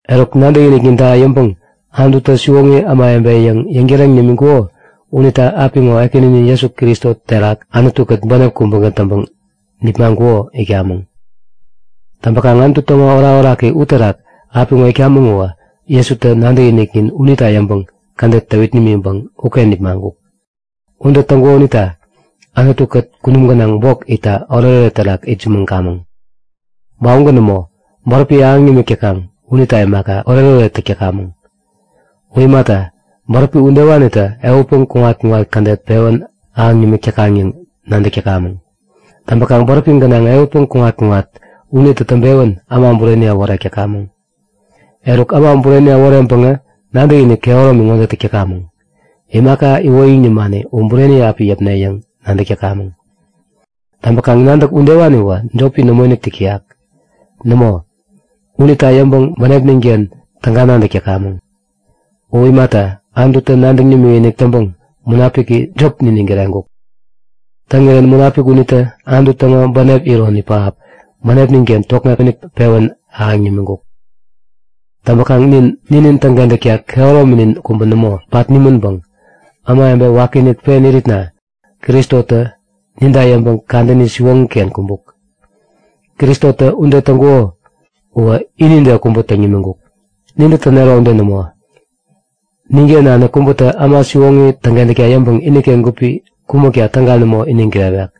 Eruk, nadäkinikninta yäŋpäŋ Anututä siwoŋi ämawebe yäŋ yäŋtäreŋ nimiŋkuko unita apiŋo Ekäninin Jesu Kristo terak Anutu-kät bänep kubägän täŋpäŋ nipmaŋkuko itkamäŋ. Täŋpäkaŋ Anutu täŋo orakoraki uterak apiŋo itkamäŋ uwä Jesutä nadäkiniknin unita yäŋpäŋ kädet täwit nimiŋpäŋ uken nipmaŋkuk. Ude täŋkuko unita Anutu-kät kunum gänaŋ bok itta oretoret terak itsämäŋkamäŋ! Ba ugän nämo. Bäräpi ahäŋ nimik täkaŋ unita imaka, oretoret täk täkamäŋ. U imata, bäräpi udewanitä ehutpäŋ kuŋat-kuŋat kädet pewän ahäŋ nimik täkaŋ yäŋ nadäk täkamäŋ. Täŋpäkaŋ bäräpi gänaŋ ehutpäŋ kuŋat-kuŋat unitä täŋpewän äma bureni äworek täkamäŋ. Eruk, äma bureni äworeŋpäŋä nadäkinik kehäromi ŋode täk täkamäŋ; Imaka iwoyäŋ nimani u bureni api yäpne yäŋ nadäk täkamäŋ. Täŋpäkaŋ nadäk udewaniwä jopi nämoinik täk täyak. Nämo, unita yäŋpäŋ bänepnin-ken tägagän nadäk täkamäŋ. U imata, Anututä nadäŋ nimikinik täŋpäŋ Munapiki jop niniŋ kireŋkuk. Täŋirän Munapik unitä Anutu täŋo bänep iron pähap bänepnin-ken tokŋek-inik pewän ahäŋ nimiŋkuk. Täŋpäkaŋ nin ninin täŋkentäkta kehärominin kubä nämo pat nimänpäŋ ämawebe wakiinik pen iritna Kristotä ninta yäŋpäŋ kadäni siwoŋi-ken kumbuk. Kristotä ude täŋkuko uwä inide kubä täŋ nimiŋkuk, nintä tänero ude nämo. Ninken nanik kubätä äma siwoŋi täŋkentäkta yäŋpäŋ iniken gupi kumäkta täga nämo iniŋ kirewek.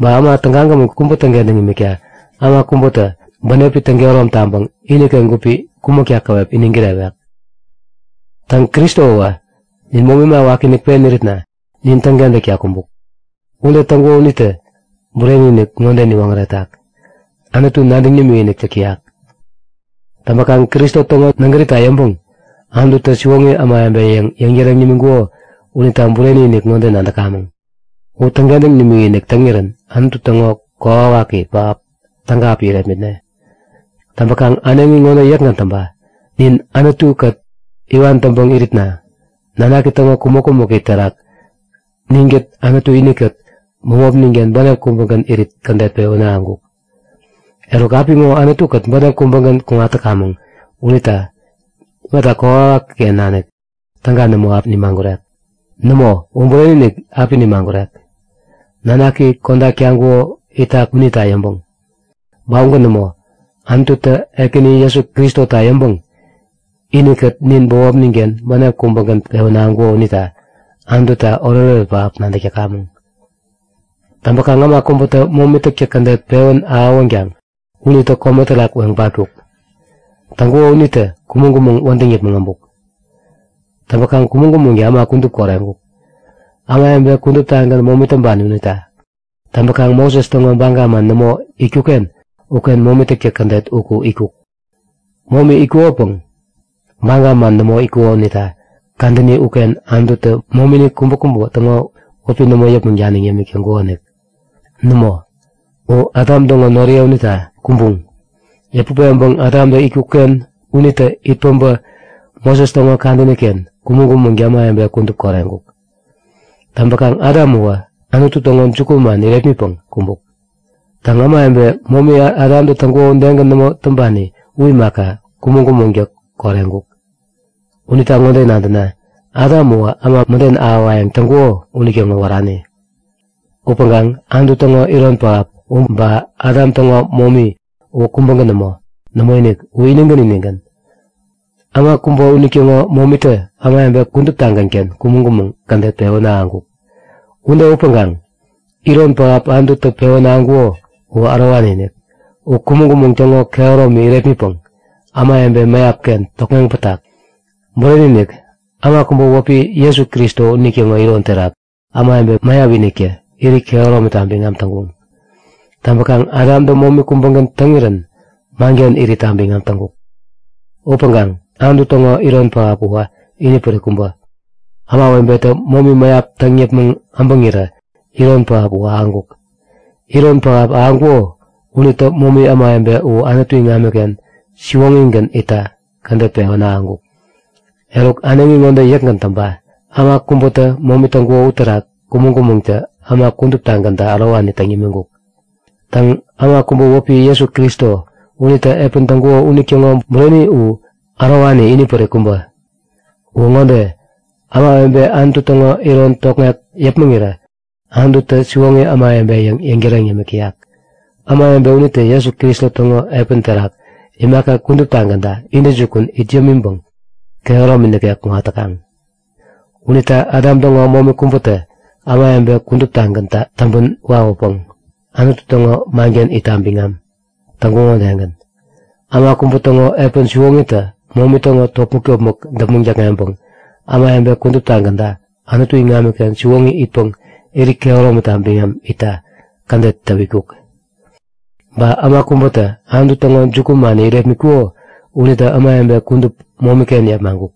Ba äma tägagämän kubä täŋkentäkta äma kubätä bänepi täŋkehärom taŋpäŋ iniken gupi kumäkta käwep iniŋ kirewek. Täŋ, Kristowä nin momi äma wakiinik pen iritna nin täŋkentäkta kumbuk. Ude täŋkuko unitä bureni-inik ŋode niwoŋäretak; Anutu nadäŋ nimikinik täk täyak. Täŋpäkaŋ Kristo täŋo nägärita yäŋpäŋ Anututä siwoŋi ämawebe yäŋ yäŋtäreŋ nimiŋkuko unita bureni-inik ŋode nadäkamäŋ; U täŋkentäŋ nimikinik täŋirän Anutu täŋo kokwawaki pähap täga api irepmitne. Täŋpäkaŋ äneŋi ŋode yäkgän täŋpa; Nin Anutu-kät iwan täŋpäŋ iritna Nanaki täŋo kumäk-kumäki terak ninkät Anutu inikät bämopnin-ken bänep kubägän irit kädet pewän ahäŋkuk. Eruk, apiŋo Anutu-kät bänep kubägän kuŋat täkamäŋ unita imata kokwawaki-ken nanik täga nämo api nimagurek? Nämo, u bureni-inik api nimagurek, Nanaki kodak taŋkuko itak unita yäŋpäŋ. Ba ugän nämo, Anututä Ekäni Jesu Kristota yäŋpäŋ inikät nin bämopnin-ken bänep kubägän pewän ahäŋkuko unita Anututa oretoret pähap nadäk täkamäŋ. Täŋpäkaŋ äma kubätä momi täktäk kädet pewän ahäwänkaŋ unitä kome terak weŋ patkuk. Täŋkuko unitä kumäŋ-kumäŋ wädäŋ yäpmäŋ äbuk. Täŋpäkaŋ kumäŋ-kumäŋtä äma kudup koreŋkuk, ämawebe kuduptagän momi täŋpani unita. Täŋpäkaŋ Moses täŋo baga man nämo itkuk-ken uken momi täktäk kädet uku itkuk. Momi itkukopäŋ baga man nämo itkuko unita kadäni uken Anututä momini kubäkubä täŋo wäpi nämo yäpmäŋ daniŋ yämik täŋkukonik. Nämo, u Adam täŋo noriye unita kumbuŋ. Yäput peŋpäŋ Adamtä itkuk-ken unitä it päbä Moses täŋo kadäni-ken kumäŋ-kumäŋtä ämawebe kudup koreŋkuk. Täŋpäkaŋ Adam uwä Anutu täŋo jukuman irepmitpäŋ kumbuk. Täŋ, ämawebe momi Adamtä täŋkuko udegän nämo täŋpani u imaka, kumäŋ-kumäŋtä koreŋkuk. Unita ŋode nadäna; Adam uwä äma mäden ahäwayäŋ täŋkuko unitäŋo wärani. Upäŋkaŋ Anutu täŋo iron pähap u ba Adam täŋo momi uwä kubägän nämo. Nämoinik, u inigän inigän. Äma kubä unitäŋo momitä ämawebe kuduptagän-ken kumäŋ-kumäŋ kädet pewän ahäŋkuk. Ude upäŋkaŋ iron pähap Anututä pewän ahäŋkuko uwä ärowani-inik. U kumäŋ-kumäŋ täŋo kehäromi irepmitpäŋ ämawebe mäyap-ken tokŋeŋ patkuk. Bureni-inik, äma kubä wäpi Jesu Kristo unitäŋo iron terak ämawebe mäyap-iniktä irit kehäromita biŋam täŋkuŋ. Täŋpäkaŋ Adamtä momi kubägän täŋirän manken iritta biŋam täŋkuk. Upäŋkaŋ Anutu täŋo iron pähap uwä inipärik kubä. Ämawebetä momi mäyap täŋ yäpmäŋ äbäŋirä iron pähap u ahäŋkuk. Iron pähap ahäŋkuko unitä momi ämawebe u Anutu iŋamiken siwoŋigän itta kädet pewän ahäŋkuk. Eruk äneŋi ŋode yäkgän täŋpa; Äma kubätä momi täŋkuko uterak kumäŋ-kumäŋtä äma kuduptagänta ärowani täŋ yämiŋkuk. Täŋ, äma kubä wäpi Jesu Kristo unitä epän täŋkuko unitäŋo bureni u ärowani inipärik kubä! Uwä ŋode; Ämawebe Anutu täŋo iron tokŋek yäpmäŋirä Anututä siwoŋi ämawebe yäŋ yäŋtäreŋ yämik täyak, ämawebe unitä Jesu Kristo täŋo epän terak imaka kuduptagänta intäjukun it yämiŋpäŋ kehäromi nikek kuŋat täkaŋ. Unita Adam täŋo momi kubätä ämawebe kuduptagäntä täŋpän wawäpäŋ Anutu täŋo manken iritta biŋam täŋkuŋo udegän, äma kubä täŋo epän siwoŋitä momi täŋo topmäk-topmäk däpmäŋ däkŋeŋpäŋ ämawebe kuduptagänta Anutu iŋamiken siwoŋi itpäŋ irit kehäromita biŋam itta kädet täwitkuk. Ba äma kubätä Anutu täŋo jukuman irepmitkuko unitä ämawebe kudup momi-ken yepmaŋkuk.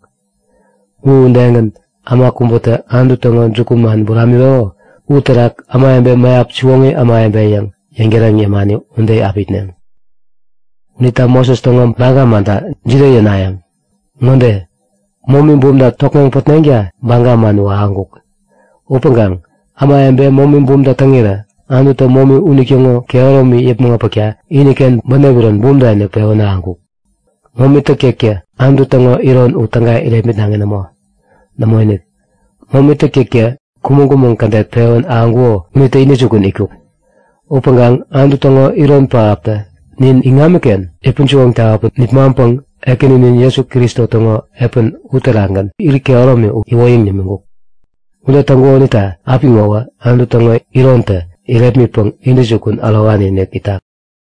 U udegän äma kubätä Anutu täŋo jukuman buramiŋkuko uterak ämawebe mäyap siwoŋi ämawebe yäŋ yäŋtäreŋ yämani ude api itneŋ. Unita Moses täŋo baga manta jide yänayäŋ? Ŋode; Momi bumta tokŋeŋ pätneŋta baga man uwä ahäŋkuk. Upäŋkaŋ, ämawebe momi bumta täŋirä Anututä momi unitäŋo kehäromi yäpmäŋ äpäkta iniken bänep iron bumta-inik pewän ahäŋkuk. Momi täktäktä Anutu täŋo iron u täga irepmitnaŋi nämo. Nämoinik. Momi täktäktä kumäŋ-kumäŋ kädet pewän ahäŋkuko unitä intäjukun itkuk. Upäŋkaŋ Anutu täŋo iron pähaptä nin iŋamiken yäpän-siwoŋ tawäpäŋ nipmaŋpäŋ Ekäninin Jesu Kristo täŋo epäni uterakgän irit kehäromi u iwoyäŋ nimiŋkuk. Ude täŋkuko unita apiŋowä Anutu täŋo irontä irepmitpäŋ intäjukun ärowani-inik itak.